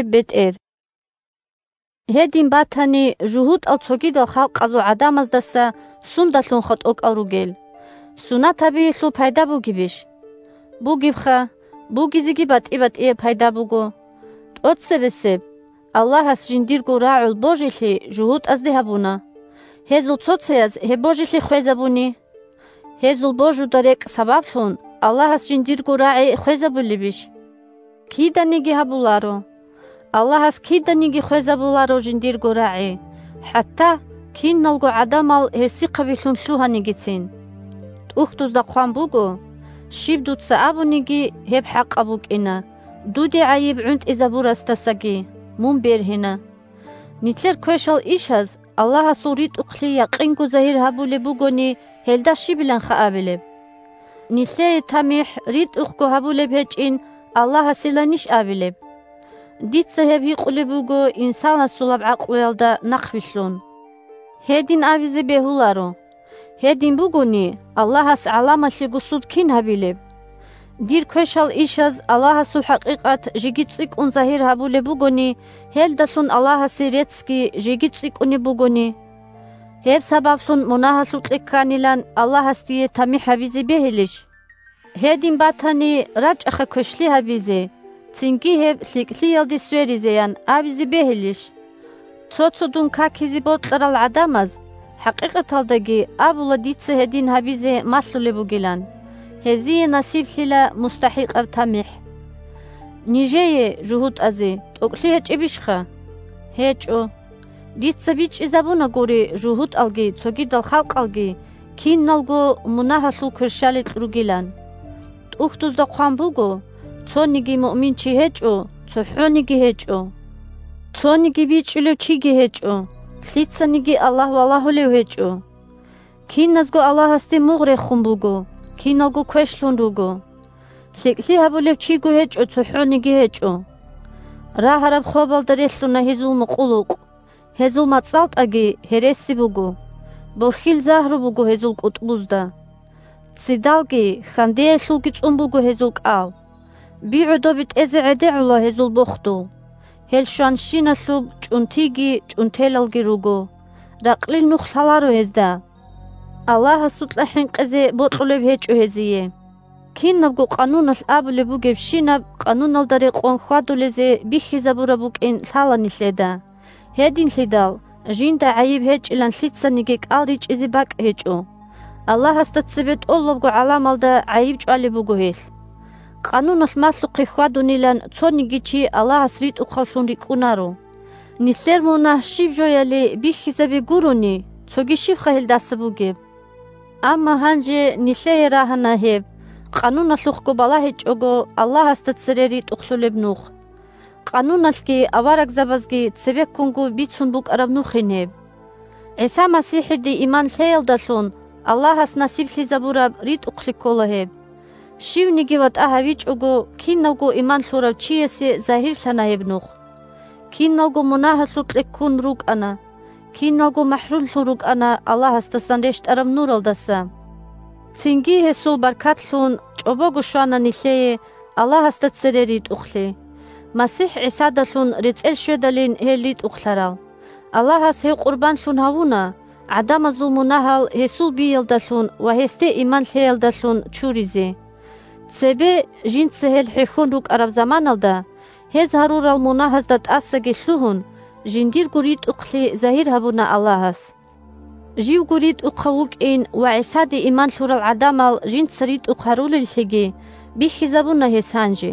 бетӀер 1Гьедин батани, жугьутӀал цогидал халкъазул гӀадамаздаса сундалъунха тӀокӀал ругел? Сунат гьабиялъул пайда бугебищ? 2Бугебха, бугизеги батӀи-батӀияб пайда буго! ТӀоцебесеб – Аллагьас жиндирго рагӀул божилъи жугьутӀазде гьабуна. 3Гьезул цо-цояз гьеб божилъи хвезабуни? Гьезул божуда рекӀкӀ сабаблъун, Аллагьас жиндирго рагӀи хвезабулебищ? Киданиги гьабуларо! Аллагьас киданиги хвезабуларо жиндирго рагӀи, хӀатта киналго гӀадамал гьерсихъабилъун лъугьанигицин. ТӀухьдузда хъван буго: «Щиб Дуца абуниги, гьеб хӀакъаб букӀина, Дуде гӀайиб гӀунтӀизабурасдасаги Мун бергьина». Нилъер квешал ишаз Аллагьасул ритӀухълъи якъинго загьир гьабулеб бугони, гьелда щибиланха абилеб? Нилъее тамихӀ ритӀухъго гьабулеб гьечӀин Аллагьасиланищ абилеб? (Дица гьеб гьикъулеб буго инсанасулаб гӀакълуялда нахъвилълъун.) Гьедин абизе бегьуларо! Гьедин бугони, Аллагьас гӀаламалъего суд кин гьабилеб? Дир квешал ишаз Аллагьасул хӀакъикъат жеги цӀикӀкӀун загьир гьабулеб бугони, гьелдалъун Аллагьасе реццги жеги цӀикӀкӀунеб бугони? Гьеб сабаблъун мунагьалъукье кканилан Аллагьас дие тамихӀ гьабизе бегьилищ? «Гьедин батани, рачӀаха квешлъи гьабизе, цинги гьеб лъикӀлъиялде сверизе!» – ян абизе бегьилищ? (Цо-цо дун какизе бокьарал гӀадамаз хӀакъикъаталдаги абула дица гьедин гьабизе малъулеб бугилан. Гьезие насиблъила мустахӀикъаб тамихӀ!) Нижее, жугьутӀазе, тӀокӀлъи гьечӀебищха? ГьечӀо! Дица бичӀчӀизабунагури, жугьутӀалги цогидал халкъалги – киналго мунагьалъул кверщаликь ругилан. ТӀухьдузда хъван буго: «Цониги муъминчи гьечӀо, цохӀониги гьечӀо. Цониги бичӀчӀулев чиги гьечӀо, лъицаниги Аллагь валагьулев гьечӀо. Киназго Аллагьасде мугъ рехун буго, киналго квешлъун руго. ЛъикӀлъи гьабулев чиго гьечӀо, цохӀониги гьечӀо. Рагьараб хобалда релълъуна гьезул мукъулукъ, гьезул мацӀалтӀаги гьереси буго. Борхьил загьру буго гьезул кӀутӀбузда. Ццидалги хьандеялъулги цӀун буго гьезул кӀал. Би гӀодобе тӀезе гӀедегӀула гьезул бохдул, Гьел щванщиналъуб чӀунтиги чӀунтелалги руго. Ракълил нух лъаларо гьезда. Аллагьасукьа хӀинкъизе бокьулеб гьечӀо гьезие». Кинабго Къануналъ абулеб бугебщинаб Къануналда рекъон хьвадулезе бихьизабураб букӀин лъала нилъеда, – гьединлъидал жинда гӀайиб гьечӀилан лъицаниги кӀал ричӀизе бакӀ гьечӀо, Аллагьасда цебе тӀолабго гӀаламалда гӀайиб чӀвалеб буго гьелъ. Къануналъ малъухъе хьвадунилан цониги чи Аллагьас ритӀухъавлъун рикӀкӀунаро. Нилъер мунагь щиб жояли бихьизаби гурони, цоги щибха гьелдаса бугеб? Амма гьанже нилъее рагьана гьеб, Къануналъухъго балагьичӀого, Аллагьасда цере ритӀухълъулеб нух. Къануналъги аварагзабазги цебеккунго бицун букӀараб нухин гьеб. ГӀиса МасихӀиде иман лъеялдалъун Аллагьас насиблъизабураб ритӀухълъи ккола гьеб. Щивниги ватӀа гьавичӀого, кинавго иман лъурав чиясе загьирлъана гьеб нух. Киналго мунагьалъукье ккун рукӀана, киналго махӀрумлъун рукӀана Аллагьасдасан рещтӀараб Нуралдаса. Цинги, Гьесул баркат лъун, чӀобого щвана нилъее Аллагьасда цере ритӀухълъи. МасихӀ ГӀисадалъун рецӀел щведалин гьел ритӀухълъарал. Аллагьас гьев къурбанлъун гьавуна, гӀадамазул мунагьал гьесул биялдалъун ва гьесде иман лъеялдалъун чуризе. Цебе, жинца гьел хӀехьон рукӀараб заманалда, гьез гьарурал мунагьазда тӀасаги лъугьун, жиндирго ритӀухълъи загьир гьабуна Аллагьас. Живго ритӀухъав вукӀин ва ГӀисаде иман лъурал гӀадамал жинца ритӀухъ гьарулеллъиги бихьизабуна гьес гьанже.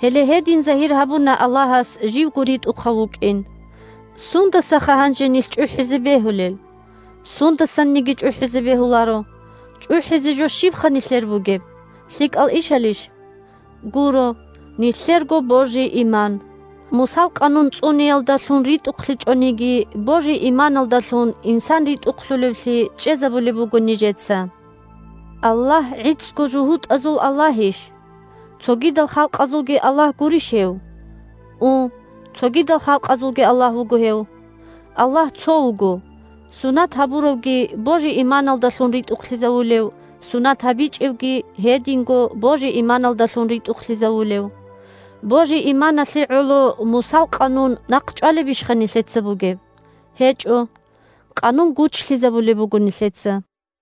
Гьеле гьедин загьир гьабуна Аллагьас живго ритӀухъав вукӀин. Сундасаха гьанже нилъ чӀухӀизе бегьулел? Сундасаниги чӀухӀизе бегьуларо. ЧӀухӀизе жо щибха нилъер бугеб? ЛъикӀал ишалищ? Гуро, – нилъерго божи-иман! Мусал Къанун цӀуниялдалъун ритӀухълъичӀониги, божи-иманалдалъун инсан ритӀухълъулевлъи чӀезабулеб буго нижеца. Аллагь гӀицӀго жугьутӀазул Аллагьищ? Цогидал халкъазулги Аллагь гурищ гьев? У, цогидал халкъазулги Аллагь вуго гьев. Аллагь цо вуго, сунат гьабуравги божи-иманалдалъун ритӀухълъизавулев, сунат гьабичӀевги – гьединго божи-иманалдалъун ритӀухълъизавулев. Божи-иманалъе гӀоло Мусал Къанун нахъчӀвалебищха нилъеца бугеб? ГьечӀо! Къанун гучлъизабулеб буго нилъеца.